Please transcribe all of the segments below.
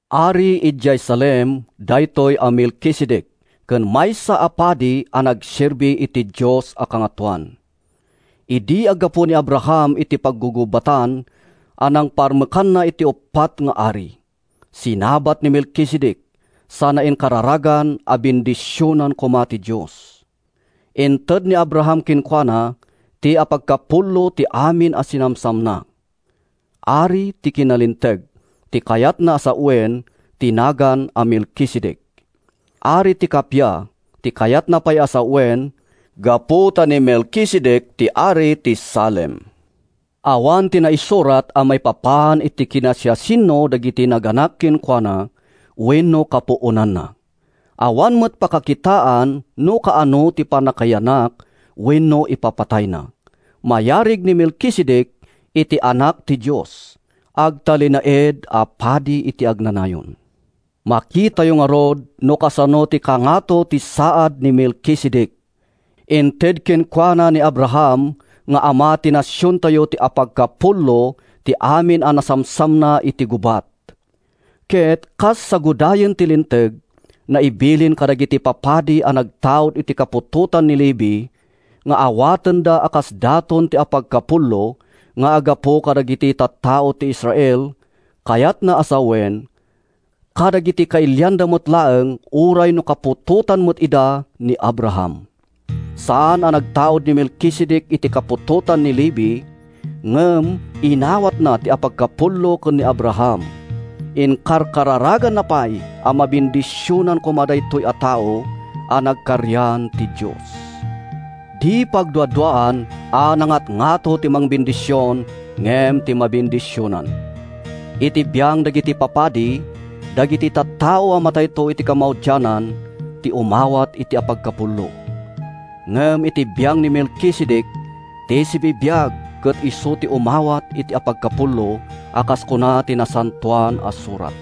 Ari idi idiay Salem daytoy a Melkisedec ken maysa a padi a nagserbi iti Dios a Kangatoan. Idi aggapu ni Abraham iti paggugubatan a nangparmekanna iti uppat nga ari, sinabat ni Melkisedec sana inkararagan a bendisionan koma ti Dios. Inted ni Abraham kenkuana ti apagkapullo ti amin a sinamsamna. (“Ari ti Kinalinteg” ti kayat a sawen ti nagan a Melkisedec. “Ari ti Kappia” ti kayatna pay a sawen gapu ta ni Melkisedec ti ari ti Salem.) Awan ti naisurat maipapan iti kinasiasino dagiti nagannak kenkuana wenno kapuonanna. Awan met pakakitaan no kaano ti pannakayanak wenno ipapatayna. Mayarig ni Melkisedec iti Anak ti Dios. Agtalinaed a padi iti agnanayon. Makitayo ngarud no kasano ti kangato ti saad ni Melkisedec! Inted kenkuana ni Abraham nga ama ti nasiontayo ti apagkapullo ti amin a nasamsamna iti gubat. Ket kas sagudayen ti Linteg, naibilin kadagiti papadi a nagtaud iti kaputotan ni Levi nga awatenda a kas daton ti apagkapullo nga aggapu kadagiti tattao ti Israel, kayatna a sawen, kadagiti kailianda met laeng uray no kaputotan met ida ni Abraham. Saan a nagtaud ni Melkisedec iti kaputotan ni Levi, ngem inawatna ti apagkapullo ken ni Abraham. Inkararaganna pay a mabendisionan koma daytoy a tao a nagkarian ti Dios. Di pagduaduaan a nangatngato ti mangbendision ngem ti mabendisionan. Iti biang dagiti papadi, dagiti tattao a matayto iti kamaudianan ti umawat iti apagkapullo. Ngem iti biang ni Melkisedec, ti sibibiag ket isu ti umawat iti apagkapullo a kas kuna ti Nasantoan a Surat.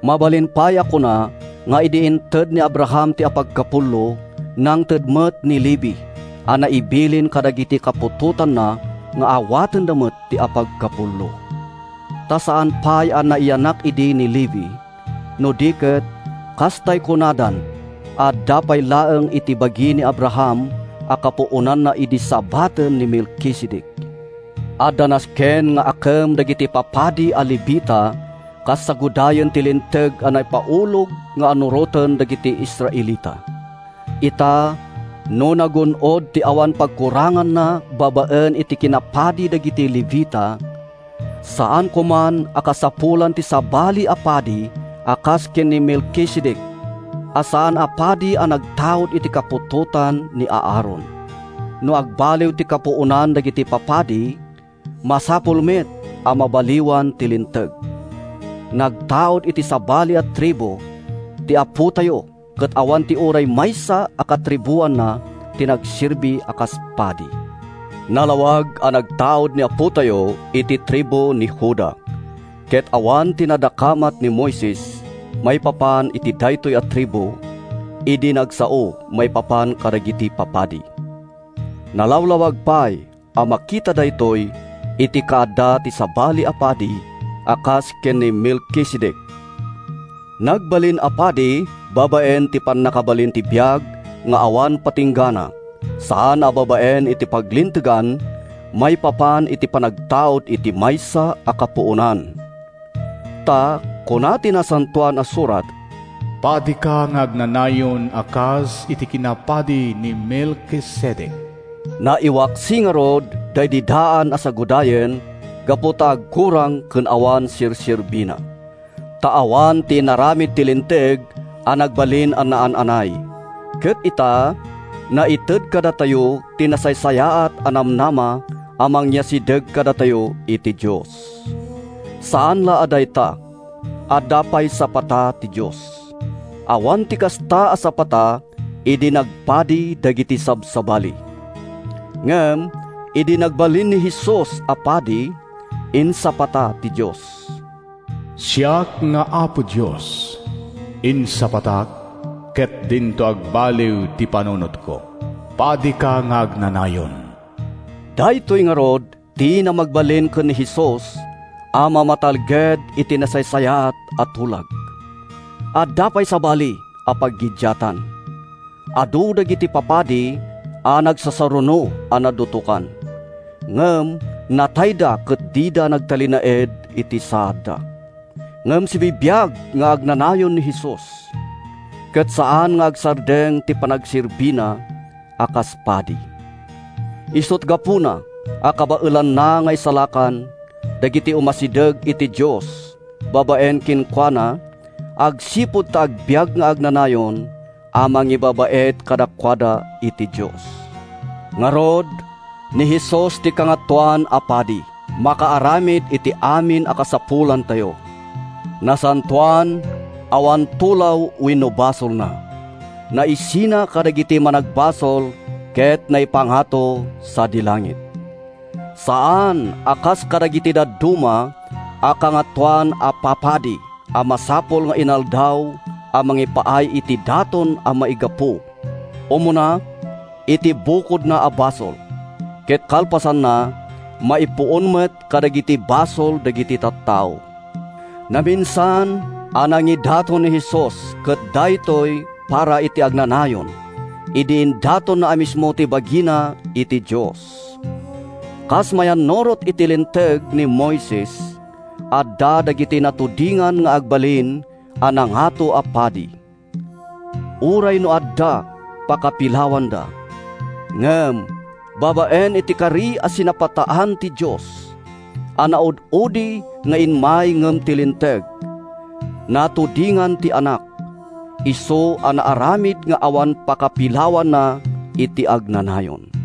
Mabalin pay a kuna nga idi inted ni Abraham ti apagkapullo, nangted met ni Levi (a naibilin kadagiti kaputotanna nga awatenda met ti apagkapullo.) Ta saan pay a nayanak idi ni Levi, no di ket, kastay kunadan, adda pay laeng iti bagi ni Abraham a kapuonanna idi sabaten ni Melkisedec. Adda nasken nga akem dagiti papadi a Levita kas sagudayen ti Linteg a naipaulog nga annuroten dagiti Israelita. Ita, no nagun-od ti awan pagkuranganna babaen iti kinapadi dagiti Levita, saan koman a kasapulan ti sabali a padi a kas ken ni Melkisedec, a saan a padi a nagtaud iti kaputotan ni Aaron. No agbaliw ti kapuonan dagiti papadi, masapul met a mabaliwan ti linteg. Nagtaud iti sabali a tribu ti Apotayo ket awan ti uray maysa a katribuanna ti nagserbi a kas padi. Nalawag a nagtaud ti Apotayo iti tribu ti Juda, ket awan ti nadakamat ni Moises maipapan iti daytoy a tribu idi nagsao maipapan kadagiti papadi. Nalawlawag pay a makita daytoy iti kaadda ti sabali a padi a kas ken ni Melkisedec. Nagbalin a padi babaen iti pannakabalin ti biag nga awan patinggana, saan a babaen iti paglintegan maipapan iti panagtaud iti maysa a kapuonan. Ta kuna ti Nasantoan a Surat, “Padika nga agnanayon a kas iti kinapadi ni Melkisedec.” Naiwaksi ngarud daydi daan a sagudayen gapu ta agkurang ken awan serserbina. Ta awan ti inaramid ti Linteg a nagbalin a naan-anay. Ket ita, naited kadatayo ti nasaysayaat a namnama a mangyasideg kadatayo iti Dios. Saan la a dayta. Adda pay sapata ti Dios. Awan ti kasta a sapata idi nagpadi dagiti sabsabali. Ngem idi nagbalin ni Jesus a padi, insapata ti Dios: “Siak nga Apo Dios, insapatak, Ket dinto agbaliw ti panunotko: ‘Padika nga agnanayon.’” Daytoy ngarud ti namagbalin ken ni Jesus a mamatalged iti nasaysayaat a tulag. Adda pay sabali a paggiddiatan: Adu dagiti papadi a nagsasaruno a nadutokan, ngem natayda ket dida nagtalinaed iti saadda. Ngem sibibiag nga agnanayon ni Jesus, ket saan nga agsardeng ti panagserbina a kas padi. Isut’ gapuna a kabaelanna nga isalakan dagiti umasideg iti Dios babaen kenkuana agsipud ta agbiag nga agnanayon a mangibabaet kadakuada iti Dios. Ngarud, ni Jesus ti Kangatoan a Padi a makaaramid iti amin a kasapulantayo. Nasantoan, awan tulaw wenno basolna, naisina kadagiti managbasol ket naipangato sadi langit. Saan a kas kadagiti dadduma a kangatoan a papadi a masapul nga inaldaw a mangipaay iti daton a maigapu, umuna, iti bukodna a basol, ket kalpasanna, maipuon met kadagiti basol dagiti tattao. Naminsan a nagidaton ni Jesus ket daytoy para iti agnanayon—idi indatonna a mismo ti bagina iti Dios. Kas mayannurot iti Linteg ni Moises, adda dagiti matudingan nga agbalin a nangato a padi, uray no adda pakapilawanda; ngem babaen iti kari a sinapataan ti Dios, a naud-udi nga immay ngem ti Linteg, matudingan ti Anak, isu a naaramid nga awan pakapilawanna iti agnanayon.